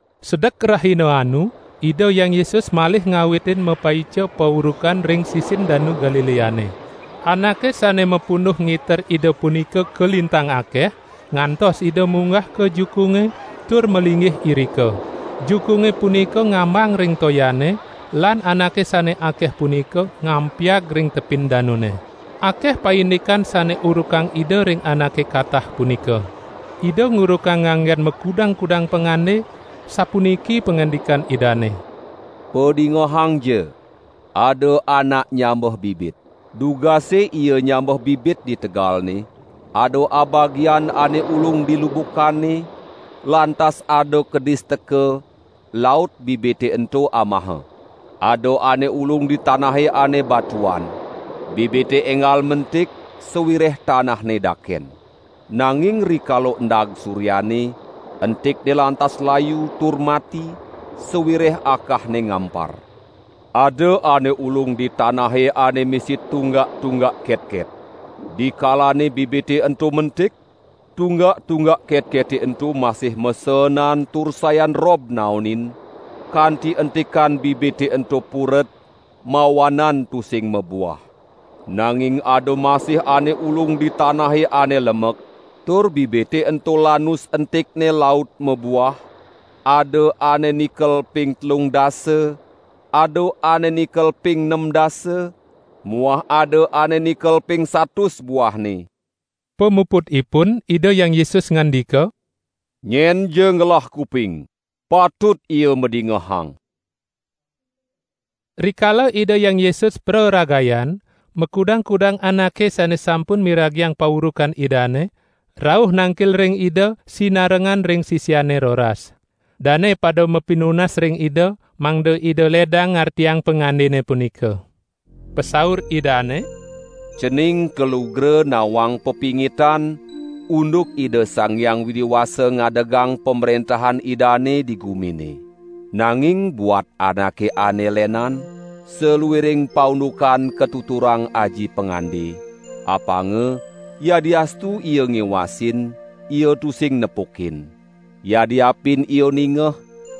Sedek rahina anu Ida Hyang Yesus malih ngawitin mapaica paurukan ring sisin Danu Galileane. Anake sane mapunduh ngiter Ida punika kalintang akeh, ngantos Ida munggah ka jukunge tur malinggih irika. Jukunge punika ngambang ring toyane, lan anake sane akeh punika ngampiag ring tepin danune. Akeh paindikan sane urukang Ida ring anake katah punika. Ida ngurukang nganggen makudang-kudang pangande, sapuniki pangandikan Idane: "Padingehangja! Ada anak nyambeh bibit. Dugase ia nyambeh bibit di tegalne, ada abagian ane ulung di lubukane, lantas ada kedis teka, laut bibite ento amaha. Ada ane ulung di tanahe ane batuan. Bibite enggal mentik sawireh tanahne daken. Nanging rikala endag suryane, entikne lantas layu, tur mati sawireh akahne ngampar. Ada ane ulung di tanahe ane misi tunggak-tunggak ketket. Dikalane bibite ento mentik, tunggak-tunggak ketkete ento masih maseenan tur sayan rob naonin, kanti entikan bibite ento puret, mawanan tusing mabuah. Nanging ada masih ane ulung di tanahe ane lemek, tur bibite ento lanus entikne laut mabuah, ada ane nikel ping telung dasa, ada ane nikel ping nem dasa, muah ada ane nikel ping satus buahne." Pamuputipun Ida Hyang Yesus ngandika: "Nyenja ngelah kuping, patut ia madingehang." Rikala Ida Hyang Yesus praragayan, makudang-kudang anake sane sampun miragiang paurukan Idane, rauh nangkil ring Ida, sinarengan ring sisiane roras. Dane pada mapinunas ring Ida, mangda Ida ledang ngartiang pangandene punika. Pasaur Idane: "Cening kalugra nawang pepingitan unduk Ida Sang Hyang Widi Wasa ngadegang Pamrentahan Idane di gumine. Nanging buat anake ane lenan, saluiring paundukan katuturang aji pangande, apanga: Yadiastu ia ngiwasin, ia tusing nepukin. Yadiapin ia ningeh,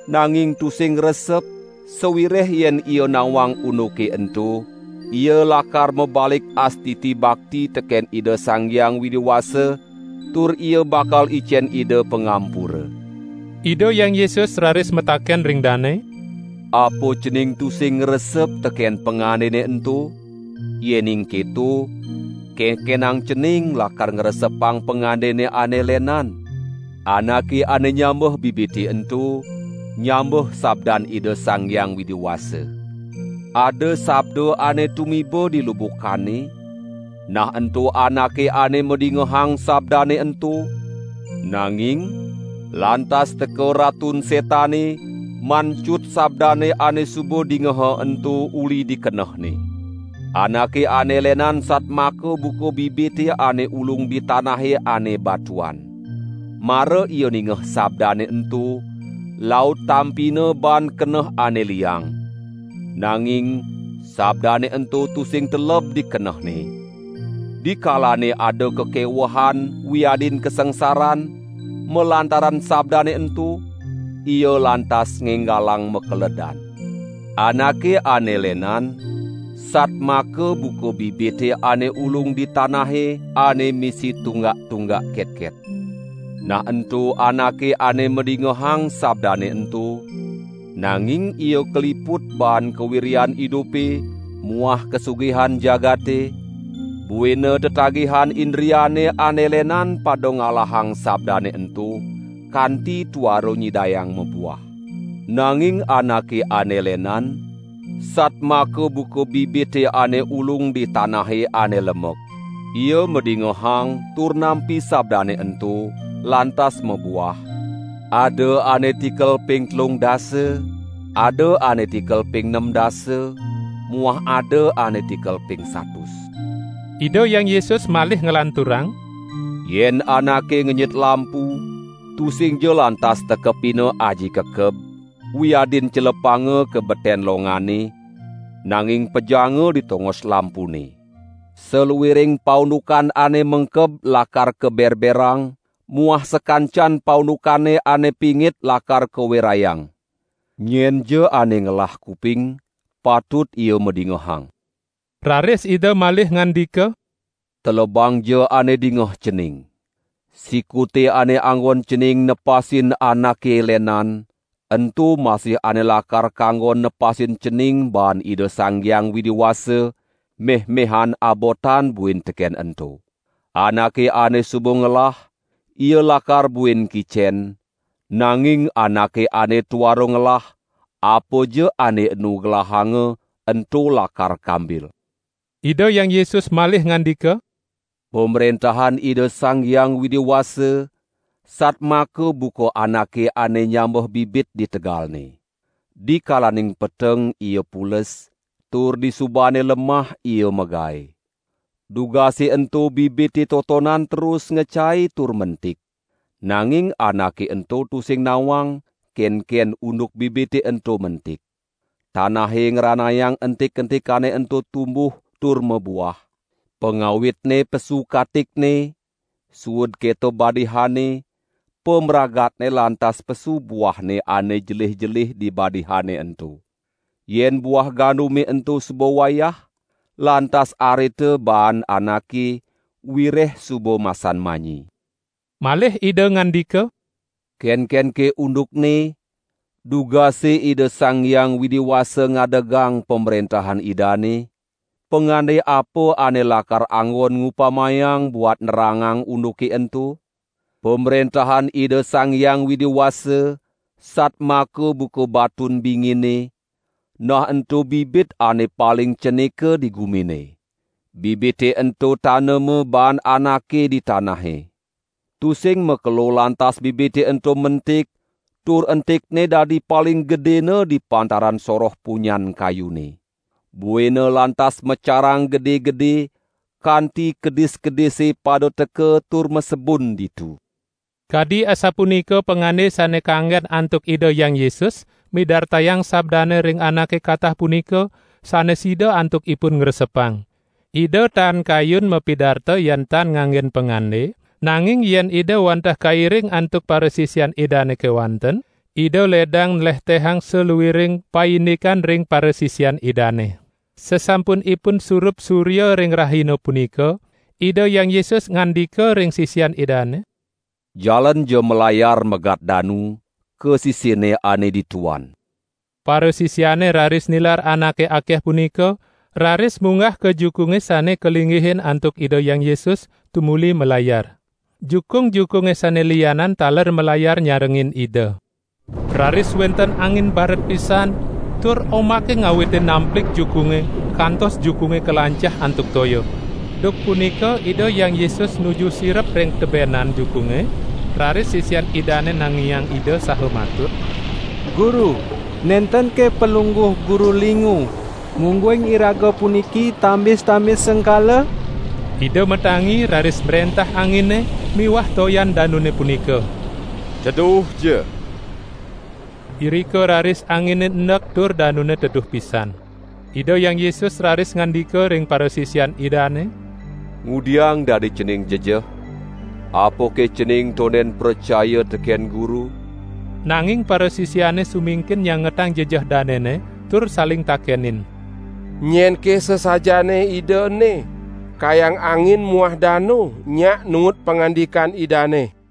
nanging tusing ngresep, sawireh yen ia nawang unduke ento, ia lakar mabalik astiti bakti teken Ida Sang Hyang Widi Wasa tur ia bakal icen Ida pangampura!" Ida Hyang Yesus raris mataken ring dane: "Apa cening tusing ngresep teken pangandene ento? Yening keto, kenkenang cening lakar ngresepang pangandene ane lenan? Anake ane nyambeh bibite ento, nyambeh sabdan Ida Sang Hyang Widi Wasa. Ada sabda ane tumiba di lubukane, nah ento anake ane madingehang sabdane ento, nanging lantas teka Ratun Setane mancut sabdane ane suba dingeha ento uli di kenehne. Anake ane lenan satmaka buka bibite ane ulung di tanahe ane batuan. Mara ia ningeh sabdane ento, laut tampina baan keneh ane liang. Nanging sabdane ento tusing teleb di kenehne. Dikalane ada kakewehan wiadin kasangsaran malantaran sabdane ento, ia lantas ngenggalang makeledan. Anake ane lenan, satmaka buka bibite ane ulung di tanahe ane misi tunggak-tunggak ketket. Nah ento anake ane madingehang sabdane ento, nanging ia kaliput baan kawiryan idupe muah kasugihan jagate, buina tetagihan indriane ane lenan pada ngalahang sabdane ento, kanti tuara nyidayang mabuah. Nanging anake ane lenan, satmaka buka bibite ane ulung di tanahe ane lemek. Ia madingehang tur nampi sabdane ento, lantas mabuah: ada ane tikel ping telung dasa, ada ane tikel ping nem dasa, muah ada ane tikel ping satus." Ida Hyang Yesus malih nglanturang: "Yen anake ngenyit lampu tusingja lantas tekepina aji kekeb, wiadin celepanga ka beten longane, nanging pejanga di tongos lampune. Saluiring paundukan ane mengkeb lakar kaberberang muah sakancan paundukane ane pingit lakar kawerayang. Nyenja ane ngelah kuping, patut ia madingehang!" Raris Ida malih ngandika: "Telebangja ane dingeh cening. Sikute ane anggon cening nepasin anake lenan, ento masih ane lakar kanggon nepasin cening baan Ida Sang Hyang Widi Wasa, meh-mehan abotan buin teken ento. Anake ane suba ngelah, ia lakar buin kicen, nanging anake ane tuara ngelah, apaja ane enu gelahanga, ento lakar kambil." Ida Hyang Yesus malih ngandika: "Pamrentahan Ida Sang Hyang Widi Wasa, satmaka buka anake ane nyambeh bibit di tegalne. Dikalaning peteng ia pules, tur disubane lemah ia magae. Dugase ento bibite totonan terus ngecai tur mentik. Nanging anake ento tusing nawang kenken unduk bibite ento mentik. Tanahe ngranayang entik-entikane ento tumbuh tur mabuah, pangawitne pesu katikne, suud keto badihane, pamragatne lantas pesu buahne ane jelih-jelih di badihane ento. Yen buah gandume ento suba wayah, lantas arita baan anake, wireh suba masan manyi." Malih Ida ngandika: "Kenkenke undukne dugase Ida Sang Hyang Widi Wasa ngadegang Pamrentahan Idane? Pangande apa ane lakar anggon ngupamayang buat nerangang unduke ento? Pamrentahan Ida Sang Hyang Widi Wasa satmaka buka batun bingine, nah ento bibit ane paling cenika di gumine. Bibite ento tanema baan anake di tanahe. Tusing makelo lantas bibite ento mentik tur entikne dadi paling gedena di pantaran soroh punyan kayune. Buina lantas macarang gede-gede, kanti kedis-kedise pada teka tur masebun ditu." Kadi asapunika pangande sane kanggen antuk Ida Hyang Yesus midartayang sabdane ring anake katah punika, sane sida antuk ipun ngresepang. Ida tan kayun mapidarta yan tan nganggen pangande, nanging yen Ida wantah kairing antuk parasisian Idane kewanten, Ida ledang nlehtehang saluiring paindikan ring parasisian Idane. Sasampunipun surup surya ring rahina punika, Ida Hyang Yesus ngandika ring sisian Idane: "Jalanja malayar megat danu, ka sisinne ane dituan." Parasisiane raris nilar anake akeh punika, raris munggah ka jukunge sane kalinggihin antuk Ida Hyang Yesus, tumuli malayar. Jukung-jukunge sane lianan taler malayar nyarengin Ida. Raris wenten angin baret pisan, tur ombake ngawitin namplig jukunge, kantos jukunge kalancah antuk toya. Duk punika Ida Hyang Yesus nuju sirep ring tebenan jukunge, raris sisian Idane nanginin Ida saha matur: "Guru, nentenke Palungguh Guru lingu, mungguing iraga puniki tambis-tambis sengkala?" Ida matangi raris mrentah angine miwah toyan danune punika: "Teduhja." Irika raris angine endek tur danune teduh pisan. Ida Hyang Yesus raris ngandika ring parasisian Idane: "Ngudiang dadi cening jejeh? Apake cening tonden pracaya teken Guru?" Nanging parasisiane sumingkin nyangetang jejeh danene, tur saling takenin: "Nyenke sasajaane Ida ene, kayang angin muah danu nyak nuut pangandikan Idane."